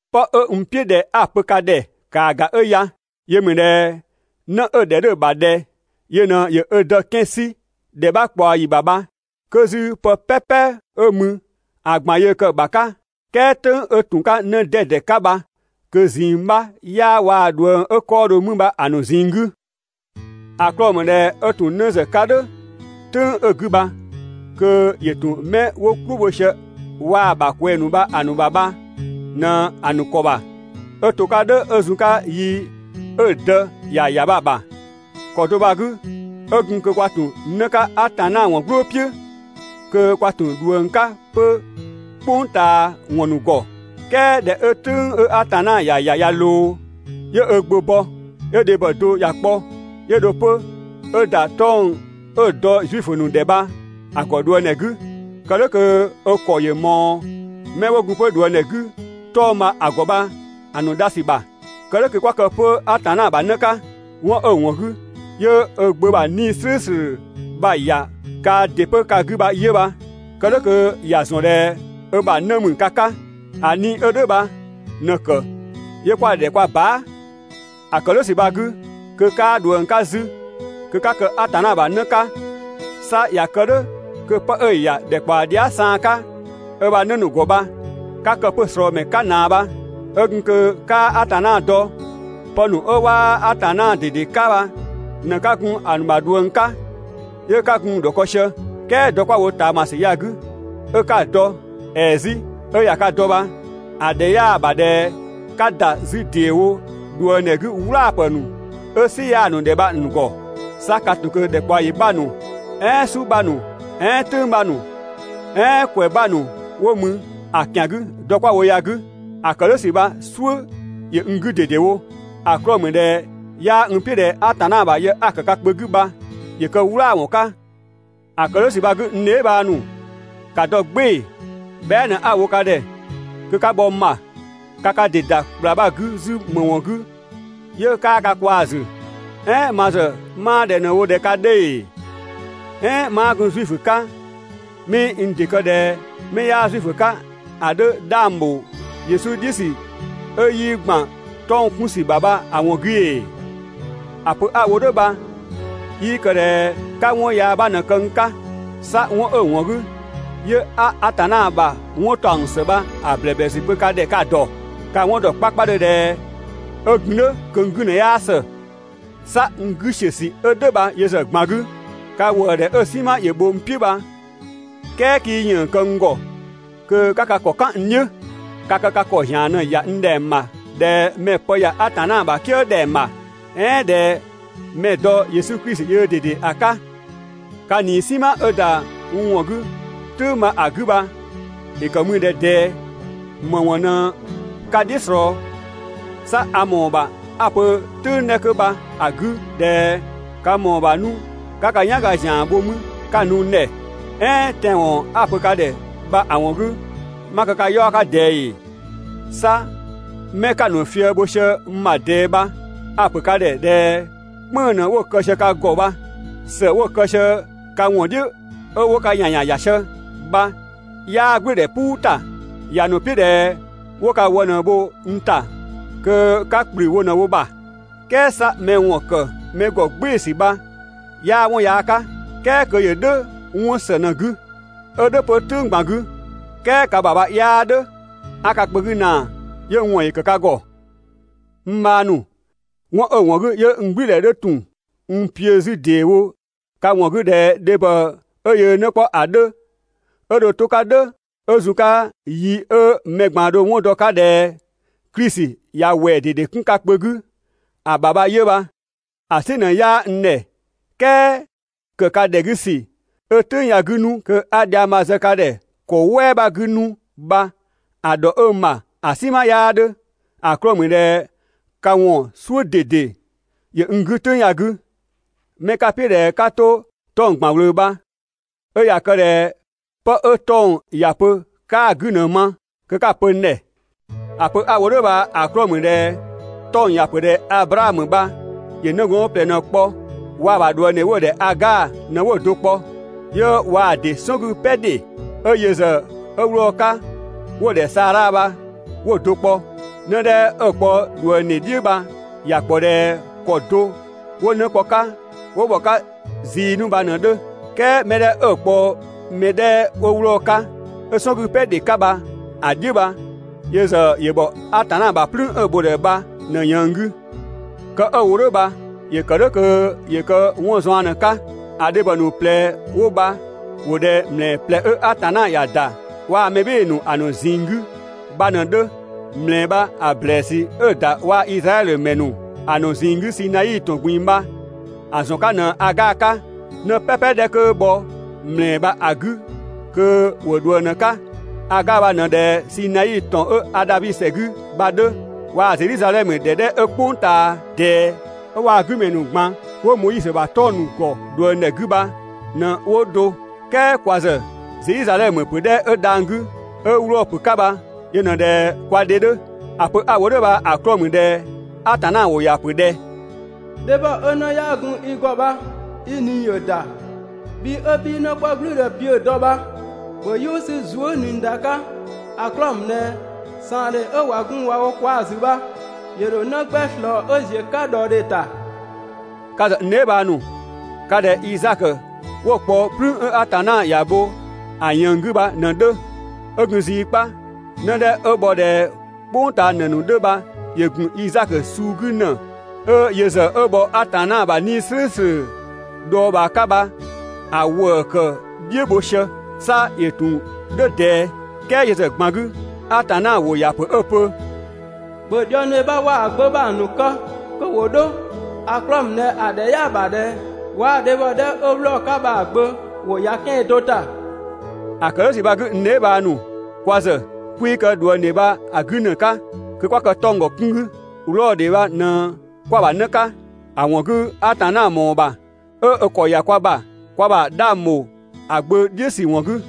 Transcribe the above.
'Pë 'ö n "piʋ̈ ꞊dhɛ 'a‑ pö bha ‑kaa ‑ga 'ö ya: Yö ‑mü ꞊dhɛ 'në 'ö‑ ‑dhɛ 'dhö‑ ‑bha ꞊dhɛ yö ꞊në ‑yö ö dë 'kɛan‑ 'sü ‑dhɛ 'bha ꞊kpaɔ ‑yi ‑bha bha, 'kö 'zü pë "pɛpɛ 'ö mü ‑a ꞊gban yöö kë‑ ‑bha 'ka, "kɛɛ "tʋ̈ng 'ö ‑tun 'ka 'në 'dɛdɛ 'ka bha kö ꞊zinng 'bha 'yaa waa‑ ꞊dhuëng 'ö 'kɔɔdhö 'mü bha‑ ‑nu ꞊zinng 'gü. ‑A 'klɔɔ‑ ‑mü ꞊dhɛ 'ö ‑tun 'në ‑zë 'ka "dhʋ̈ "tʋ̈ng 'ö‑ 'gü bha kö ‑yö ‑tun 'mɛ 'wo "klʋ bho sië waa‑ ‑bha ꞊kwɛɛ‑ ‑nu bha‑ ‑nu ‑bha bha ꞊në‑ ‑nu ‑kɔ ‑bha, 'ö to‑ 'ka "dhʋ̈ 'ö zun‑ 'ka yi 'ö‑ dë ‑ya ‑ya bha‑ ‑bha. ‑Kɔ do bha‑ 'gü, 'ö ‑gun kö kwa ‑tun 'në 'ka Atanna ‑wɔn "gblʋʋ "piʋ̈, kö kwa ‑tun ꞊dhuëng 'ka 'pö "kpʋng ꞊taa ‑wɔn ‑nu ‑gɔ. "Kɛɛ ꞊dhɛ 'ö "tʋ̈ng 'ö Atanna ‑ya ‑ya ꞊ya ꞊loo, 'yö ö Gbö bɔ, 'yö dhebhɔ do ‑ya kpɔ, 'yö dho 'pö 'ö ‑da 'tɔng‑ 'ö‑ dɔ Zuifö ‑nu ‑dhɛ bha‑ ‑gɔ ꞊dhuëngdhɛ 'gü, Kë "dhʋ̈ kö ö ‑kɔ ‑yö ꞊mɔɔ 'mɛ 'wo gun 'pö ꞊dhuëngdhɛ 'gü 'tɔng‑ bha‑ ‑gɔ bha‑ ‑nu dha ‑sü ‑bha, kë "dhʋ̈ kö 'kwa kë 'pö Atanna ‑bha 'në 'ka. 'Wɔn 'ö‑ ‑wɔn 'gü 'yö ö Gbö ‑bha 'Nii‑ "slʋ̈ʋ̈slʋ̈ bha‑ ‑ya kaa ‑dɩ 'pö 'gü bha 'yö bha, kë "dhʋ̈ kö ‑ya ‑zɔn ꞊dhɛ ö ‑bha 'në ‑mü ka 'ka. ‑A 'Nii‑ 'ö "dhʋ̈ bha ꞊në‑ ‑kë 'yö 'kwa‑ ‑dhɛ kwa baa". ‑A ‑kë "dhʋ̈ ‑sü bha‑ 'gü, kö 'kaa ꞊dhuëng 'ka 'zü, kö 'ka kë Atanna ‑bha 'në 'ka, 'sa ꞊ya kë "dhʋ̈ kö 'pë 'ö‑ ‑ya ‑dhɛkpaɔ dhia" saan 'ka ö ‑bha 'në ‑nu ‑gɔ bha 'ka kë 'pö‑ ꞊slɔɔmɛ 'ka ꞊naa bha. 'Ö gun kö 'kaa Atanna dɔ, pë ‑nu 'ö 'waa Atanna ꞊dede 'ka bha ꞊në 'ka gun‑ ‑nu ‑bha ꞊dhuëng 'ka 'yö 'ka gun‑ ‑dhɔkë sië. "Kɛɛ dɔ 'kwa‑ wo ꞊taamasü ya‑ 'gü 'ö 'ka‑ dɔ, ‑ɛɛ 'zü 'ö ꞊ya ka dɔ bha, ‑a ‑dhɛ 'yaa‑ ‑bha ꞊dhɛ 'ka ‑da 'zü ‑deewo ꞊dhuëngdhɛ 'gü "wlaapë ‑nu 'ö "sɩ 'yaa‑ ‑nu ‑dhɛ bha‑ ‑nu ‑gɔ. 'Sa ka ‑tun ꞊kö ‑dhɛkpaɔyi 'bha ‑nu, "ɛɛn "su 'bha ‑nu, "ɛɛn "tʋ̈ng 'bha ‑nu, "ɛɛn ‑kwɛ 'bha ‑nu 'wo mü ‑a ‑kian 'gü dɔ 'kwa‑ wo ya‑ 'gü. ‑A ‑kë "dhʋ̈ ‑sü bha‑ "suʋ̈ ‑yö n 'gü ꞊dedewo. ‑A 'klɔɔ‑ ‑mü ꞊dhɛ 'yaa n "piʋ̈ ꞊dhɛ Atanna ‑bha yë 'a‑ ‑kë ka kpö 'gü bha ‑yö kë "wlaawɔn 'ka. ‑A ‑kë "dhʋ̈ ‑sü bha‑ 'gü n dheebhang ‑nu, ‑ka dɔ "gbɩɩ‑, bhɛa" ꞊në 'a‑ wo ka ‑dhɛ kö 'ka bhɔ n ‑bha. (Ka ka ‑dɩ ‑da ‑kpla bha‑ 'gü 'zü ‑më ‑wɔn 'gü 'yö 'kaa ka kwaa‑ ‑zü.) "Ɛɛn ma ‑zë 'maa ꞊dhɛ ꞊në‑ wo ꞊dhɛ ka 'dhö ‑ee? ("Ɛɛn 'maa gun Zuifö 'ka 'mii n ‑dɩ kë ꞊dhɛ 'mɛ 'yaa Zuifö 'ka ‑a 'dhö ‑dha 'dhang ‑bho Yesu "dhiʋ̈ ‑sü 'ö 'yii ‑gban 'tɔng‑ 'kun ‑sü bha bha‑ ‑wɔn 'gü ‑ee?) ‑A pö 'a‑ wo "dhʋ̈ bha 'yii kë ꞊dhɛ 'ka 'wɔn yaa 'bha ꞊në kë n 'ka. 'Sa 'wɔn 'ö‑ ‑wɔn 'gü 'yö 'a Atanna ‑bha 'wɔn ‑taɔng ‑së bha‑ ‑blɛblɛsü pö ka ‑dhɛ ka‑ ‑dɔ. Ka‑ 'wɔn ‑dɔ 'kpakpadhö ꞊dhɛ 'ö gun "dhʋ̈ kö n 'gü ꞊në 'yaa ‑së. 'Sa n 'gü ‑siö ‑sü 'ö "dhʋ̈ bha yö ‑zë ꞊gban 'gü, ka ‑wëëdhɛ 'ö‑ "sinma ‑yö bho n "piʋ̈ bha "kɛɛ 'kii ‑yënng kë n ‑gɔ kö 'ka ka ‑kɔ "kan n "dhiʋ̈. Ka kë ka ‑kɔ ‑zian ꞊në‑ ‑ya n ‑dhɛng ‑bha ꞊dhɛ mɛ‑ pë ‑ya Atanna ‑bha "kië ‑dhɛng ‑bha, "ɛɛn ꞊dhɛ mɛ ‑dɔ Yesu Klisi yöö ꞊dede ‑a 'ka. Ka ꞊nii "sinma 'ö ‑da n ‑wɔn 'gü "tʋ̈ng bha‑ 'gü bha ‑yö ‑kë mü ꞊dhɛ ꞊dɛɛ, ‑më ‑wɔn ꞊në ka "dhiʋ̈ ꞊slɔɔ? 'Sa a ‑mɔɔ ‑bha 'a‑ pö‑ "tʋ̈ng 'dhɛ 'kö bha‑ 'gü ꞊dhɛ ka ‑mɔɔ ‑bha 'nu 'ka ka "yanga ‑zian bho mü 'ka‑ nu n ‑dhɛ! "Ɛɛn tɛanwɔn 'a‑ pö ka ‑dhɛ bha‑ ‑wɔn 'gü, 'ma kë ka 'yaɔ‑ 'ka ꞊dɛɛ ‑ee? 'Sa 'mɛ 'ka‑ ‑nu fië‑ bho sië n ‑bha ꞊dɛɛ bha a‑ ‑pö ka ‑dhɛ ꞊dhɛ "kpënng‑ ꞊në 'wo‑ kë sië ka ‑gɔ bha. ‑Së 'wo‑ kë sië ka ‑wɔn "dhʋ̈ 'ö 'wo ka ‑yanyan ‑ya sië bha 'yaa "gblʋ̈ʋ̈dhɛ "puu ‑ta. ‑Ya ‑nu "piʋ̈ ꞊dhɛ 'wo ka wë ꞊në bho n ‑ta kö 'ka ‑kplü wo ꞊në wo ‑bha. "Kɛɛ 'sa mɛ ‑wɔn ‑kë mɛ ‑gɔ "gbɩɩ‑ ‑sü bha 'yaa 'wɔn yaa 'ka, "kɛɛ kö yö "dhʋ̈ 'wɔn ‑së ꞊në‑ 'gü, 'ö "dhʋ̈ 'pö "tʋ̈ng ꞊gban 'gü. "Kɛɛ ka ‑bha bha 'yaa "dhʋ̈, 'a ka kpö 'gü ꞊naa 'yö n ‑wɔn ‑yö ‑kë ka ‑gɔ. N bhang ‑nu, 'wɔn 'ö‑ ‑wɔn 'gü 'yö n "gblʋ̈ʋ̈dhɛ 'dhö ‑tun n piʋ̈‑ 'zü ‑deewo ka ‑wɔn 'gü ꞊dhɛ dhebhɔ 'ö yöö 'në 'kpɔ ‑a 'dhö, 'ö dho to‑ 'ka "dhʋ̈ 'ö zun‑ 'ka yi 'ö mɛ ꞊gban dho‑ 'wɔn dɔ‑ 'ka ꞊dhɛ Klisi ꞊ya ‑wɛɛ ꞊dede 'kun ka kpö 'gü ‑a ‑bha bha 'yö bha. ‑A "sɩ ꞊në 'yaa n ‑dhɛ "kɛɛ ‑kë ka ‑dhɛ 'gü ‑sü 'ö "tʋ̈ng ya‑ 'gü 'nu kö 'a dhiang bha‑ zë ka ‑dhɛ ‑kɔ "wɛɛ 'bha 'gü 'nu bha‑ ‑dhɔ 'ö n ‑bha ‑a "sinma 'yaa 'dhö, ‑a 'klɔɔ‑ ‑mü ꞊dhɛ ka ‑wɔn "suʋ̈ ꞊dede ‑yö n 'gü "tʋ̈ng ya‑ 'gü. 'Mɛ ka‑ "piʋ̈ ꞊dhɛ 'ka 'to 'tɔng‑ ꞊gban ꞊wlöö bha 'ö ꞊ya kë ꞊dhɛ 'pë 'ö 'tɔng‑ ‑ya pö 'kaa‑ 'gü ꞊në‑ ma kö 'ka‑ pö n ‑dhɛ. ‑A pö 'a‑ wo "dhʋ̈ bha‑ 'klɔɔ‑ ‑mü ꞊dhɛ 'tɔng‑ ‑ya ‑pö ꞊dhɛ Ablaamö bha ‑yö 'nëgɔɔn ꞊plɛ ꞊në‑ kpɔ. Waa‑ ‑bha ꞊dhuëngdhe ('wo‑ ‑dhɛ Agaa) ꞊në 'wo‑ do kpɔ, 'yö waa‑ ‑dɩ "sɔn 'gü "pɛ ‑dhe 'ö yö ‑zë 'ö 'wlɔɔ‑ 'ka ('wo‑ ‑dhɛ Saadha) bha 'wo‑ do kpɔ. 'Në 'dhɛ 'ö‑ kpɔ ꞊dhuëngdhe "dhiʋ̈ bha ‑ya ‑kpɔ ꞊dhɛ ‑kɔ do 'wo 'në kpɔ‑ 'ka 'wo ‑bhɔ 'ka zii 'nu bha ꞊në‑ 'dhö. "Kɛɛ mɛ 'dhɛ 'ö‑ kpɔ‑ mɛ 'dhɛ 'ö 'wlɔɔ‑ 'ka, 'ö‑ "sɔn 'gü "pɛ ‑dhe 'ka bha‑ "dhiʋ̈ bha yö ‑zë ‑yö ‑bhɔ Atanna ‑bha "plüün 'ö‑ bho‑ ‑dhɛ bha ꞊në ꞊yënng 'gü. Kë 'ö‑ wo "dhʋ̈ bha ‑yö ‑kë "dhʋ̈ kö ‑yö kë 'wɔn zaɔn ꞊në‑ 'ka: ‑A dhebhɔ ‑nu ꞊plɛ 'wo bha ‑wo ꞊dhɛ ‑mlɛɛ ꞊plɛ 'ö Atanna ‑ya ‑da waa‑ mɛ "bhɩɩ‑ ‑nu ‑a ‑nu ꞊zinng 'gü bha ꞊në‑ 'dhö. ‑Mlɛɛ bha‑ ‑blɛɛsü 'ö‑ ‑da waa‑ Izraɛdhö ‑mɛ ‑nu ‑a ‑nu ꞊zinng 'gü Sinai ‑tɔn ꞊gbin‑ bha‑ ‑zɔn 'ka ꞊në Agaa 'ka. 'Në "pɛpɛ 'dhɛ 'kö bhɔ ‑mlɛɛ bha‑ 'gü kö ‑wo ꞊dhuëng ꞊në‑ 'ka. Agaa bha ꞊në ꞊dhɛ Sinai ‑tɔn 'ö Adhabi ‑sɛ 'gü bha‑ 'dhö, waa‑ Zedhizadhɛmö ‑dhɛ 'dhɛ 'ö "kpʋng ꞊taa ꞊dɛɛ 'ö waa‑ 'gü ‑mɛ ‑nu ꞊gban 'wo (Moizö ‑bha 'tɔng‑ ‑nu ‑gɔ ꞊dhuëngdhɛ 'gü) bha ꞊në 'wo do. "Kɛɛ kwa ‑zë Zedhizadhɛmö ‑pö 'dhɛ 'ö dhang‑ 'gü, 'ö 'wlɔɔ‑ ‑pö 'ka bha, yö ꞊në ꞊dhɛ kwa dhe 'dhö. ‑A pö 'a‑ wo "dhʋ̈ bha‑ 'klɔɔ‑ ‑mü ꞊dhɛ Atanna ‑wʋ ‑ya ‑pö ꞊dhɛ: «Dhebhɔ 'ö 'në 'yaa gun i ‑gɔ bha i ꞊nii ‑yö ‑da, bhi 'ö 'bhii 'në 'kpɔ "gblʋ̈ʋ̈dhɛ piʋ̈‑ dɔ bha, ‑bhö "yʋʋ 'sü zuë" ꞊nii ‑da 'ka! ‑A 'klɔɔ‑ ‑mü ꞊dhɛ ꞊saandhe 'ö ꞊wa gun ꞊wa wo kwaa‑ ‑zü bha ‑yö ‑dho 'në 'gbɛ ꞊slɔɔ 'ö ‑ziö 'ka ꞊dhɔɔdhe ‑ta.» Ka ‑zë, n dheebhang ‑nu, ka ꞊dhɛ Izaakö 'wo‑ kpɔ "plüün 'ö Atanna ‑ya bho ‑a ꞊yënng 'gü bha ꞊në‑ 'dhö. 'Ö gun zii 'kpa, 'në 'dhɛ 'ö bhɔ ꞊dhɛ "kpʋng ꞊taa ‑në ‑nu 'dhö bha ‑yö ‑gun Izaakö suu 'gü ‑në 'ö yö ‑zë 'ö bhɔ Atanna ‑bha 'Nii‑ "slʋ̈ʋ̈slʋ̈ dhɔɔbhaa 'ka bha‑ ‑wëë ‑kë "dhiʋ̈ bho sië. 'Sa ‑yö ‑tun "dhʋ̈ ꞊dɛɛ. "Kɛɛ yö ‑zë ꞊gban 'gü, Atanna ‑wʋ ‑ya ‑pö 'ö‑ pö: «‑Bhö ꞊dhuëngdhe bha waa‑ gbö bha‑ ‑nu kë kö ‑wo 'dho, ‑a 'klɔɔ‑ ‑mü ꞊dhɛ ‑a ‑dhɛ 'yaa‑ ‑bha ꞊dhɛ waa‑ dhebhɔ 'dhɛ 'ö 'wlɔɔ‑ 'ka bha‑ gbö ‑wo ‑ya 'kɛan‑ do ‑ta.» ‑A ‑kë "dhʋ̈ ‑sü bha‑ 'gü n dheebhang ‑nu, kwa ‑zë 'kwii kë ꞊dhuëngdhe bha‑ 'gü ‑në 'ka (kö 'kwa kë 'tɔng‑ ‑gɔ 'kun 'gü), 'wlɔɔdhe bha ꞊në 'kwa‑ ‑bha 'në 'ka, (‑a ‑wɔn 'gü, Atanna ‑mɔɔ ‑bha 'ö ö ‑kɔ ‑ya kwa ‑bha kwa ‑bha 'dhang ‑bho ‑a Gbö "dhiʋ̈ ‑sü ‑wɔn 'gü.)